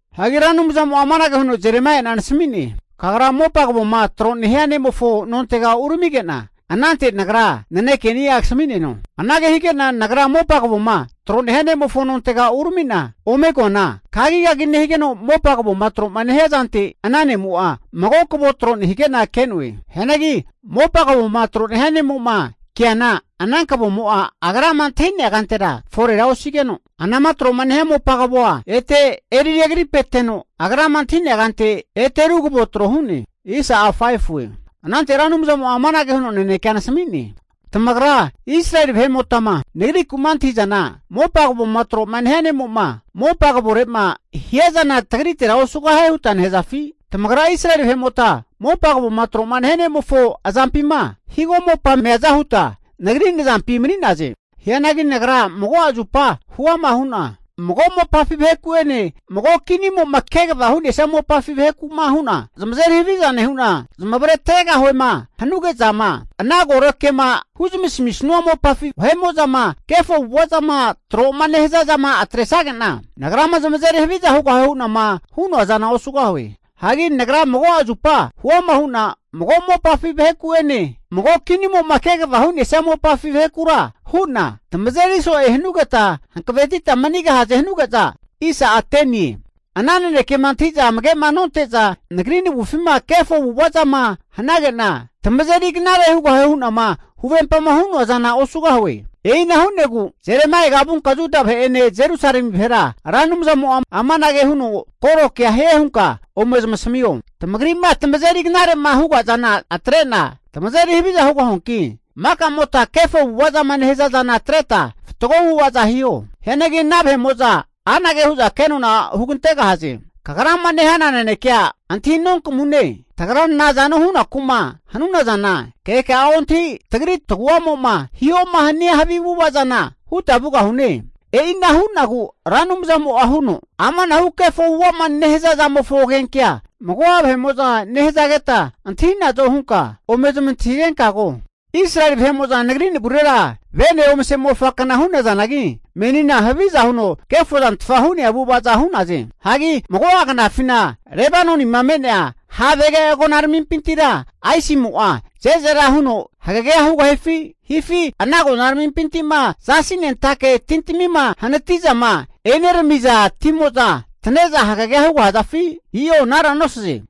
Hagi Ra Anumzamo'a amanage huno Jeremaia'na nasami'ne. Kagra mopa kavoma tro nehia ne'mofo nontega uramige'na, anante Nagra nanekeni'a kasami'neno. Anage hige'na nagra mopa kavoma tro nehia nemofo nontega urami'na ome koana, kagikagi nehigeno mopa kavoma tro'ma nehia zante ana ne'mo'a mago kavo tro nehige'na ke'noe. Hianagi mopa kavoma tro nehia ne'mo'ma keana ana kavomo'a agrama antahi'nea kantera forera osigeno, anama tro'ma nehia mopa kavoa ete eri regripeteno agrama antahi'nea kante ete ru kavo tro hu'ne. Anante Ra Anumzamo'a amanage huno nanekea nasami'ne. Tamagra Israeli vahe'motama Nagriku'ma antahi'zana, mopa kavoma tro'ma nehia nemo'ma mopa kavore'ma hiazana tagritera osugahie huta nehazafi? Tamagra Israeli vahe'mota mopa kavoma tro'ma nehia ne'mofo azampima, higo mopama meaza huta, Nagri nazampi mani'naze. Hianagi Nagra mago'a zupa huama hu'na, mago mopafi vaheku'ene mago kinimo'ma kegavama hu'nesia mopafi vaheku'ma hu'na, zamazeri haviza nehu'na zamavare atregahuema hanuge'zama, ana koro kema huzamisanua mopafi vahe'mo'zama kefo avu'ava zama tro'ma nehaza zama atresage'na, Nagrama zamazeri haviza hugahue hu'nama hu'noa zana osugahue. Hagi Nagra mago'a zupa huama hu'na, mago mopafi vaheku'ene mago kinimo'ma kegavama hu'nesia mopafi vahekura hu'na, tamazeri so'e hanugeta hankavetita manigahaze hanuge'za, ana nanekema antahi'za amage'ma nonte'za, Nagri navufima kefo avu'ava zama hanage'na, tamazeri knare hugahue hu'nama huvempama hu'noa zana osugahue. E'ina hu'negu Jeremaiaga vunka Juda vahe'ene Jerusalemi vahera Ra Anumzamo'a amanage huno koro kea hie hunka ome zamasamio. Tamagri'ma tamazeri knare'ma huga zana atre'na tamazeri haviza hugahuanki, makamota kefo avu'ava zama nehaza zana atreta fatgo avu'ava'za hiho. Hianagi ana vahe'mo'za anage hu'za kenona hugantegahaze. Kagrama nehana nanekea antahi nonkamune. Tagra nazano hunaku'ma hanuna zana, keka'a ontahi tagri tagu'amo'ma hihoma hania havi avu'ava zana huta vugahune. E'ina hu'nagu Ra Anumzamo'a huno, amanahu kefo avu'ava'ma nehaza zamofo agenkea mago'a vahe'mo'za nehazageta antahi'nazo hunka ome zamantahigenka ko. Israeli vahe'mo'za Nagri navurera vene omase mofakna hu'nazanagi, menina haviza huno kefozantfa hu'nea avu'ava'za hu'naze. Hagi mago'a knafina Lebanonima me'nea havege agonaramimpintira aisimo'a ze'zera huno hagegea hugafi? Hifi ana agonaramimpinti'ma zasi nentake tintamima hanati'zama eneramiza timo'za tane'za hagegea hugahazafi? I'o anara nosaze.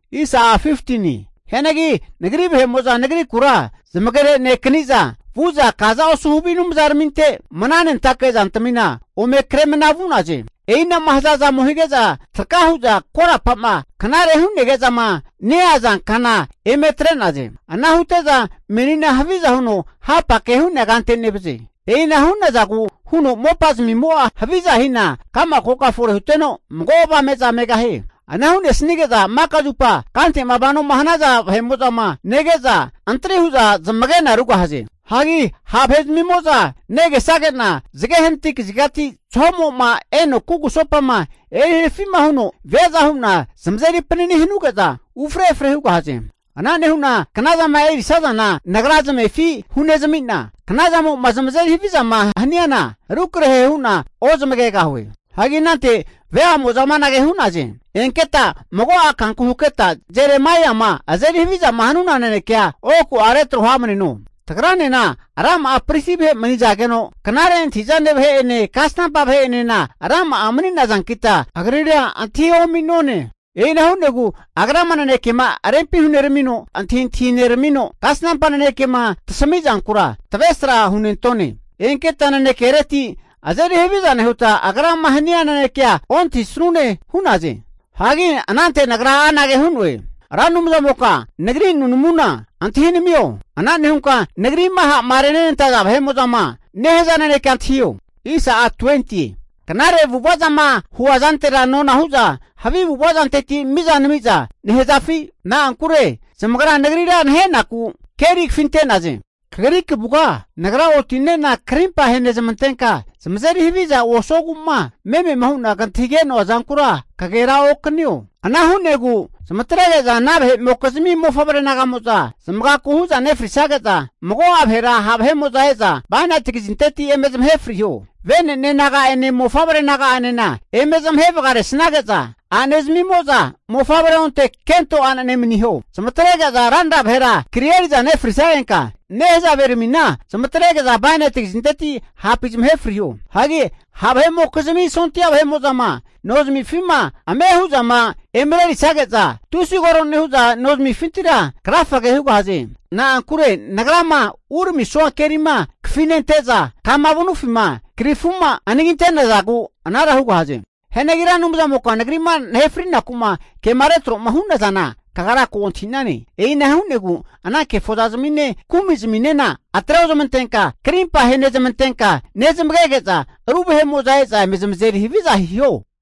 Hianagi Nagri vahe'mo'za nagrikura zamagenekani'za, vu'za kaza osu havi anumzaraminte mnanentake zantamina ome kremana vu'naze. E'inama haza zamo hige'za traka hu'za korapa'ma knare hu'negeza'ma neaza kana eme atre'naze. Ana hute'za menina haviza huno hapake hu'nea kante nevaze. E'ina hu'nazagu huno mopa zamimo'a haviza hina ka'ma koka fore huteno mago avame'za megahie. Ana hu'nesanige'za maka zupa kante'ma vanoma hanaza vahe'mo'zama nege'za, antri huza zamagena rugahaze. Hagi ha' vahe'zamimo'za negesage'na zage hanati kazigati zahomo'ma eno kugusopama eri harafi'ma huno viaza hu'na zamazeri panani hanuge'za ufre efre hugahaze. Ana nehu'na knazama erisazana Nagra namefi hunezami'na, knazamo'ma zamazeri havizama haniana, rukrahera hu'na ozamagegahue. Hagi anante veamo'za amanage hu'naze. Enketa mago'a kanku haketa Jeremaiama azeri havizama hanuna nanekea oku retro hamneno. Tagranena rama'a pristi vahe manizageno, knare antahi'zane vahe'ene kasnampa vahe'enena rama'a mani nazankita agrira antahi omi'none. E'ina hu'negu agrama nanekema rempi huneramino antahintahi neramino, kasnampa nanekema tasami'zankura tavesra hunentone. Enketa nanekereti azeri haviza nehuta, agrama hania nanekea ontahisanune hu'naze. Hagi anante nagra anage hu'noe. Ra Anumzamoka nagri nunamuna antahinamio. Ana nehunka nagri'ma ha'ma renenantaza vahe'mo'zama nehaza nanekea antahio! Knare avu'ava zama hua zantera nona hu'za havi avu'ava zanteti mizana nami'za nehazafi? Na'ankure zamagra nagrira nahenaku keri kafinte'naze. Kagri kavuga nagra oti'nena karimpa ahenezamantenka zamazeri haviza osuogu'ma memema hu'na kantahige'noa zankura kagera okanio. Ana hu'negu zamatrege'za ana vahe'mokizmi mofavre naga'mo'za zamagaku hu'za nefrisage'za, mago'a vahera ha' vahe'mo'za e'za bainati kazinteti eme zamahe friho. Vene'ne naga'ene mofavre naga'enena eme zamahe vagaresnage'za a'nezmimo'za mofavrea onte kento a'nene maniho. Zamatrege'za ranra vahera kri eri'za nefrisagenka, nehazaveramina zamatrege'za bainati kazinteti hapi zamahe friho. Ha' vahe'mokizmi sondia vahe'mo'zama nozamifima ame hu'zama emarerisage'za, tusi koro nehu'za nozamifintira krafage hugahaze. Na'ankure nagrama uramisua kerima kafinente'za, kama vanufima krifuma anagi ante'nazagu anara hugahaze. Hianagi Ra Anumzamoka nagri'ma nahe fri'naku'ma kema retro'ma hu'nazana kagra ko antahi'nane. E'ina hu'negu ana kefozazamine kumi'zaminena atre ozamantenka krimpa ahenezamantenka nezmagege'za ru vahe'mo'za e'za eme zamazeri haviza hiho.